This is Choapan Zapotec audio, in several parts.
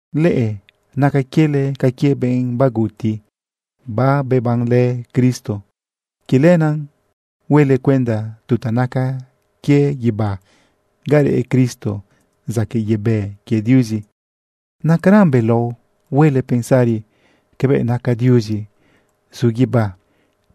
Leꞌe naca quiele ca quie benꞌ baguti babebanlë Cristo. Quie lenaꞌ huele cuenda tu ta naca quie guibá ga reꞌ Cristo zaquëꞌ yebë quie Diuzi. Nacaran belao huele pensari cabëꞌ naca Diuzi zu guibá.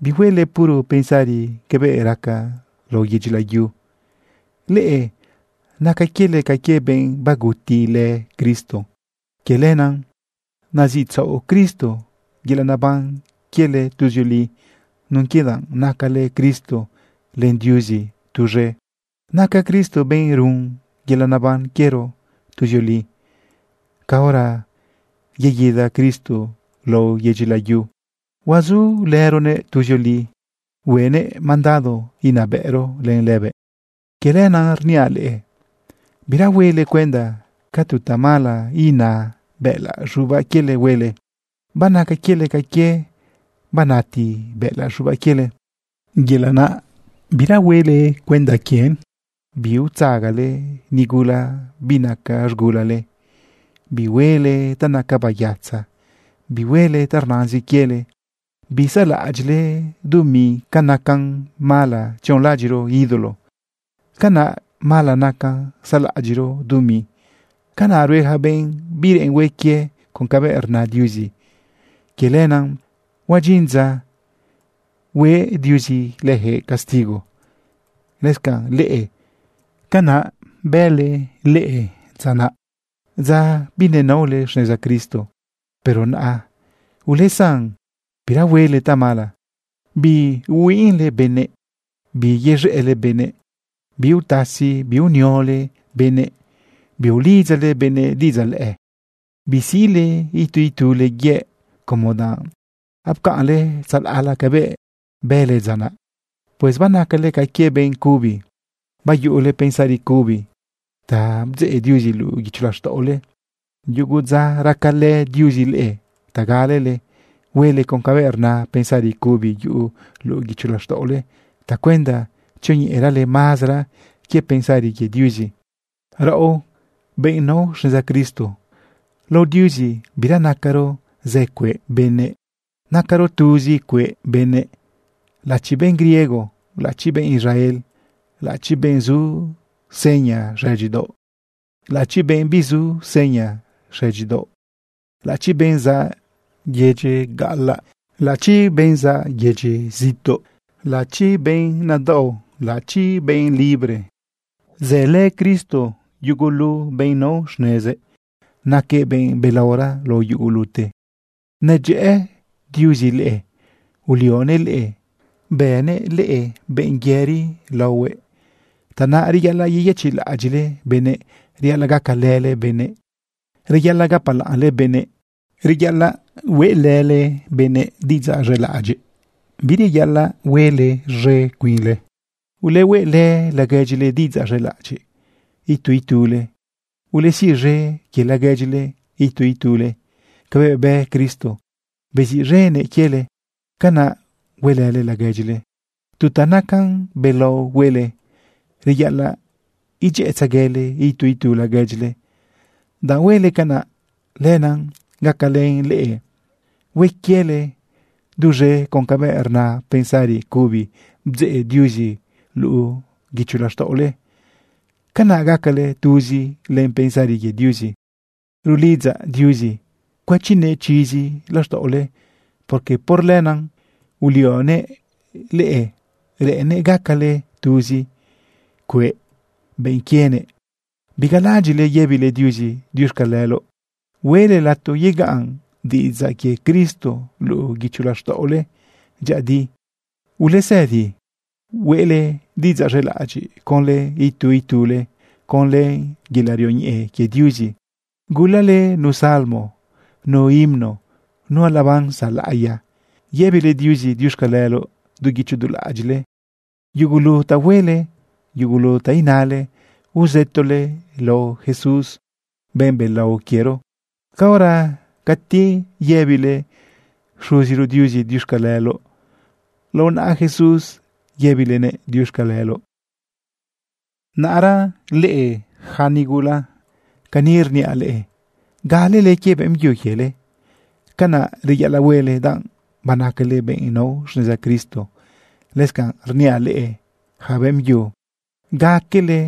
Bihuele puro pensari cabëꞌ raca lao yedyi layu. Leꞌe naca quiele ca quie benꞌ bagutilë Cristo. Quie lenaꞌ naziꞌtzaoꞌ Cristo yelaꞌ naban quiele tuzioli nun quie danꞌ nacalë Cristo len Diuzi tuz̃e. Naca Cristo benꞌ run yelaꞌ naban quiero tuzioli. Caora yeguida Cristo lao yedyi layu, huazulëronëꞌ tuzioli. Huenëꞌ mandado inabëꞌro len lëbëꞌ. Quie lenaꞌ rniaꞌ leꞌe, bira huele cuenda ca tu tamala ina bëꞌëlaꞌ z̃ubaꞌ quiele huele. Banaca quiele ca quie banati bëꞌëlaꞌ z̃ubaꞌ quiele, yelaꞌ naꞌ bira huele cuenda quien. Biutzagale nigula binaca z̃gulale. Bihuele ta naca bayatza. Bihuele ta rnazin quiele. Bisaꞌlaꞌadyiꞌle dumi. Ca nacan mala tzionlaꞌadyiꞌro ídolo, canaꞌ mala nacan saꞌlaꞌadyiꞌro dumi. Canaꞌ rue yaca benꞌ bireꞌen hue quie con cabëꞌ rna Diuzi. Quie lenaꞌ huadyin dza hue Diuzi leyaquëꞌ castigo. Lëscanꞌ leꞌe, canaꞌ bële leꞌe dza naꞌ, dza binenaole xneza Cristo. Pero naꞌa ulesan bira huele tamala. Biihuinꞌle benëꞌ. Biyez̃ëꞌle benëꞌ. Biutasi biuniole benëꞌ. Biulidzale benëꞌ diꞌidzaꞌ lëꞌë. Bisiꞌle itu itule yëꞌ, como danꞌ apcaꞌnle tzalaꞌla cabëꞌ bële dza naꞌ. Pues banacale ca quie benꞌ cubi, bayuꞌule pensari cubi ta bdzeꞌ Diuzi luꞌu guicho laxtaꞌole. Yugu dza racalë Diuzi leꞌe ta galele huele con cabëꞌ rna pensari cubi yuꞌu luꞌu guicho laxtaꞌole tacuenda tzioñeꞌerale mazara quie pensari quie Diuzi. Raꞌo, benꞌ nao xneza Cristo, lao Diuzi bira nacaro zë cueꞌ benëꞌ. Nacaro tuzi cueꞌ benëꞌ, laꞌachi benꞌ griego, laꞌachi benꞌ Israel, laꞌachi benꞌ zu seña xëdyidaoꞌ, laꞌachi benꞌ bizu seña xëdyidaoꞌ, laꞌachi benꞌ zaꞌ yedyi gaꞌalaꞌ, laꞌachi benꞌ zaꞌ yedyi zituꞌ, laꞌachi benꞌ nadaꞌo, laꞌachi benꞌ libre. Zëlë Cristo yugulu benꞌ nao xnezëꞌ. Naquëꞌ benꞌ belaora lao yugulute. Nadyëꞌë Diuzi leꞌe. Ulionëꞌ leꞌe bënëꞌ leꞌe benꞌ yëri laohuëꞌ. Tanaꞌ reyaꞌalaꞌ yeyëchiꞌlaꞌadyiꞌle benëꞌ, reyaꞌalaꞌ gacalële benëꞌ, reyaꞌalaꞌ gapalaꞌnle benëꞌ, reyaꞌalaꞌ hueꞌlële benëꞌ diꞌidzaꞌ z̃elaꞌadyiꞌ. Bireyaꞌalaꞌ huele z̃e cuinle. Ulehueꞌlë laguedyile diꞌidzaꞌ z̃elaꞌadyiꞌ itu itule. Ulesiꞌz̃e quie laguedyile itu itule. Cabëꞌ bë Cristo beziꞌz̃enëꞌ quiele, canaꞌ huelële laguedyile. Tu ta nacan belao huele, reyaꞌalaꞌ idyëꞌëtzeguele itu itu laguedyile. Danꞌ huele canaꞌ, lenaꞌ gacalën leꞌe hue quiele duz̃e con cabëꞌ rna pensari cubi bdzeꞌ Diuzi luꞌu guicho laxtaꞌole. Canaꞌ gacale tuzi len pensari quie Diuzi. Rulidzaꞌ Diuzi cuëchinëꞌ chizi laxtaꞌole, porque por lenaꞌ ulionëꞌ leꞌe reꞌennëꞌ gacale tuzi cueꞌ benꞌ quienëꞌ. Bigalaꞌadyiꞌle yëbile Diuzi diuxcaleloꞌ. Hueꞌle lato yegaꞌn diꞌidzaꞌ quie Cristo luꞌu guicho laxtaꞌole dyëꞌëdi. Ulesëdi hueꞌle diꞌidzaꞌ z̃elaꞌadyiꞌ conlë itu itule conlë yelaꞌ rioñeꞌe quie Diuzi. Gulale nu Salmo, nu himno, nu alabanza laꞌiya. Yëbile Diuzi diuxcaleloꞌ du guicho du laꞌadyiꞌle. Yugulu ta huele, yugulu ta inale, uzëtole lao Jesús, benꞌ belao quiero. Caora cati yëbile Xuziro Diuzi diuxcaleloꞌ, lao naꞌa Jesús yëbilenëꞌ diuxcaleloꞌ. Naꞌra leꞌe yaca nigula, cani rniaꞌ leꞌe: Galele quie beꞌmbyu quiele. Canaꞌ reyaꞌalaꞌ huele, danꞌ banacale benꞌ nao xneza Cristo. Lëscanꞌ rniaꞌ leꞌe yaca beꞌmbyu: Gaquele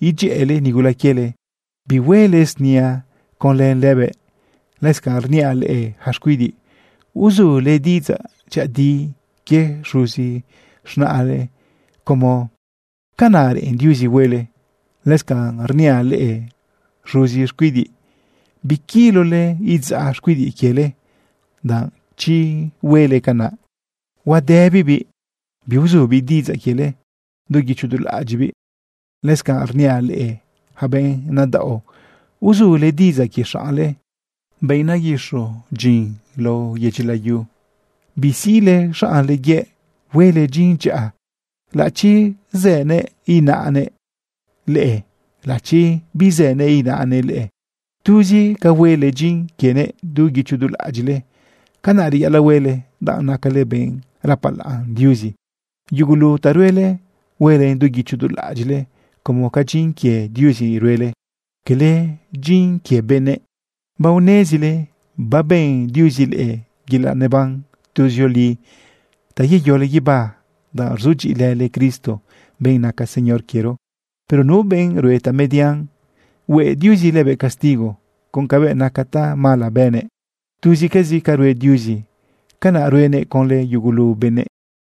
idyëꞌële nigula quiele. Bihuele snia conlë lëbëꞌ. Lëscanꞌ rniaꞌ leꞌe yaca xcuidiꞌ: Uzule diꞌidzaꞌ dyëꞌëdi quie xuzi z̃naꞌle, como canaꞌ reꞌen Diuzi huele. Lëscanꞌ rniaꞌ leꞌe xuzi xcuidiꞌ: Biquilole idzaꞌ xcuidiꞌ quiele, danꞌ chi huele canaꞌ huadëbibiꞌ biuzubiꞌ diꞌidzaꞌ quiele du guicho du laꞌadyiꞌbiꞌ. Lëscanꞌ rniaꞌ leꞌe yaca benꞌ nadaꞌo: Uzule diꞌidzaꞌ quie xaꞌnle, benꞌ naguixo dyin lao yedyi layu. Bisiꞌle xaꞌnle yëꞌ. Huele dyin dyaꞌa, laꞌachi zënëꞌ inaꞌnëꞌ leꞌe, laꞌachi bizënëꞌ inaꞌnëꞌ leꞌe. Tuz ca huele dyin quienëꞌ du guicho du laꞌadyiꞌle. Canaꞌ reyaꞌalaꞌ huele, danꞌ nacale benꞌ rapalaꞌn Diuzi. Yugulu ta ruele, huelen du guicho du laꞌadyiꞌle como ca dyin quie Diuzi ruele, quele dyin quie benëꞌ. Baonezile baben Diuzi leꞌe yelaꞌ neban tuzioli ta yeyole guiba danꞌ rzudyiꞌilële Cristo, benꞌ naca Señor quiero. Pero nu benꞌ rue tamedian, hue Diuzi lëbëꞌ castigo con cabëꞌ naca tamala bënëꞌ. Tuzcazi ca rue Diuzi, canaꞌ ruenëꞌ conlë yugulu benëꞌ.